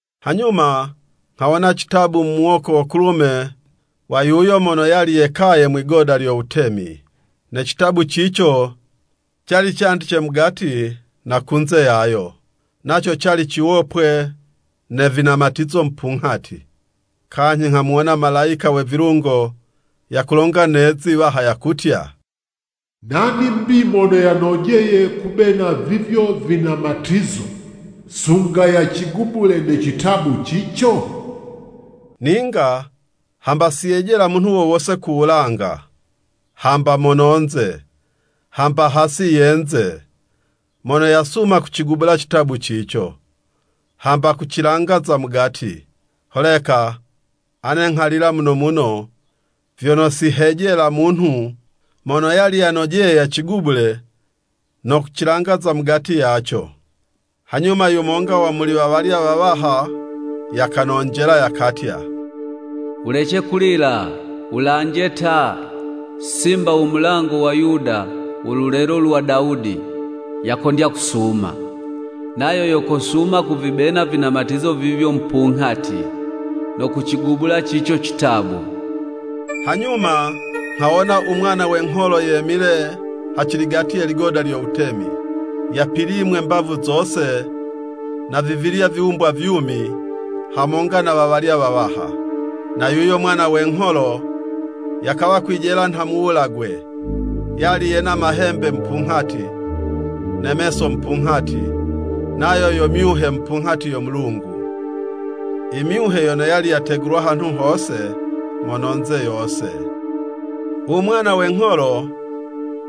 Hanyuma nghawona citabu mu muwoko wo kulume wa yuyo mono yali yekaye mwigoda lyo wutemi, ne citabu cico, cali candice mugati na kunze yayo, naco cali ciwopwe ne vinamatizo mupunghati. Kanyhi nghamuwona malayika we vilungo yakulonga ne'zi 'waha yakutya, “Nani 'mbi mono yanojeye kubena vivyo vinamatizo, sunga yacigubule ne citabu cico?” Ninga hamba si yejela munhu wo wose ku wulanga, hamba mono'nze, hamba hasi ye yinze, mono yasuma kucigubula citabu cico, hamba kucilanga za mugati. Holeka ane nghalila muno muno, vyono si hejela munhu mono yali yanojeye yacigubule no kucilanga za mugati yaco. Hanyuma yumonga wa muli wawalya wawaha yakanonjela yakutya, “Wulece kulila! Wulanje ta! Simba wo mulango wa Yuda, wo lulelo lwa Dawudi, yakondya kusuma. Nayo yo kosuma kuvibena vinamatizo vivyo mupunghati, no kucigubula cico citabu.” Hanyuma nghawona u Mwana we ngholo yemile haciligati ye ligoda lyo wutemi, yapilimwe mbavu zose na vivilya viwumbwa vyumi, hamonga na wawalya wawaha. Na yuyo Mwana we ngholo yakawa kwijela nha muwulagwe. Yali yena mahembe mupunghati, ne meso mupunghati, nayo yo myuhe mupunghati yo Mulungu, i myuhe yono yali yategulwa hanhu hose mono'nze yose. U Mwana we ngholo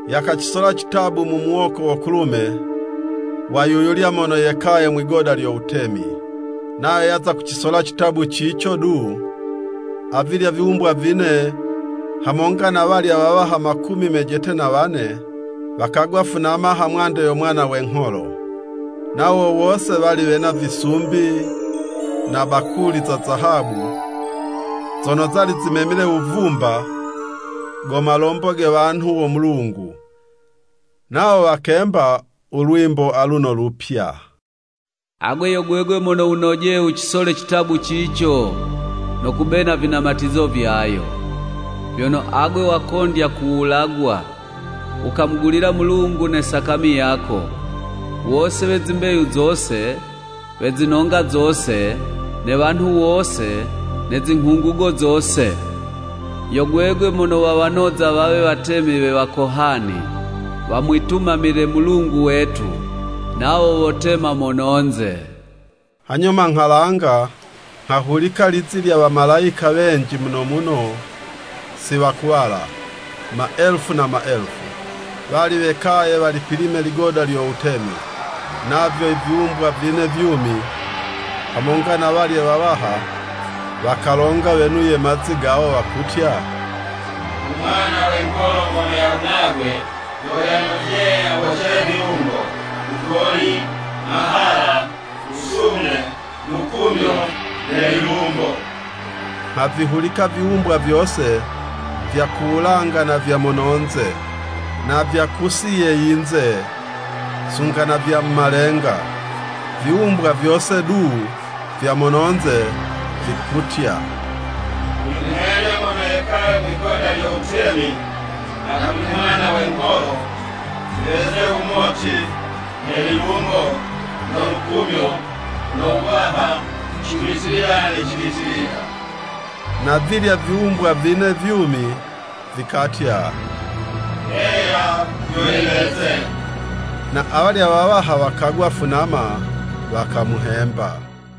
yakacisola citabu mu muwoko wo kulume wa yu yulya mono yekaye mwigoda lyo wutemi. Nayo yaza kucisola citabu cico du, avilya viwumbwa vine hamonga na walya wawaha makumi mejete na wane, wakagwa funama hamwande yo Mwana we ngholo. Nawo wose wali wena visumbi na bakuli za Zahabu, zono zali zimemile wuvumba, go malombo ge wanhu wo Mulungu. Nawo wakemba u lwimbo aluno lupya. “Agwe yo gwegwe mono wunojeye wucisole citabu cico, no kubena vinamatizo vyayo. Vyono agwe wakondya kuwulagwa, wukamugulila Mulungu ne sakami yako, wose we zimbeyu zose, we zinonga zose, ne wanhu wose ne zinghungugo zose. Yo gwegwe mono wawanoza wawe wutemi we wakohani, wamwitumamile Mulungu wetu, nawo wotema mono'nze.” Hanyuma nghalanga, nghahulika lizi lya wamalayika wenji muno wono si wakuwala, maelufu na maelufu. Wali wekaye walipilime ligoda lyo wutemi, navyo viwumbwa vine vyumi, hamonga na walye wawaha, wakalonga wenuye mazi gawo wakutya, “U Mwana we ngholo mono yawulagwe, yo yanojeye yabocele vilungo, wugoli, mahala, wusume, lukumyo ne lilumbo.” Nghavihulika viwumbwa vyose vya ku wulanga na vya mono'nze, na vya kusi ye yinze, sunga na vya mu malenga, viwumbwa vyose du vya mono'nze, vikutya, “Kuli mwene mono yekaye mwigoda lyo wutemi, na kuli Mwana we ngholo, viweze wumoti, ne lilumbo, no lukumyo, no wuwaha cibitilila ne cibitilila!” Na vilya viwumbwa vine vyumi, vikatya, “Heya vyo yiweze.” Na awalya wawaha wakagwa funama wakamuhemba.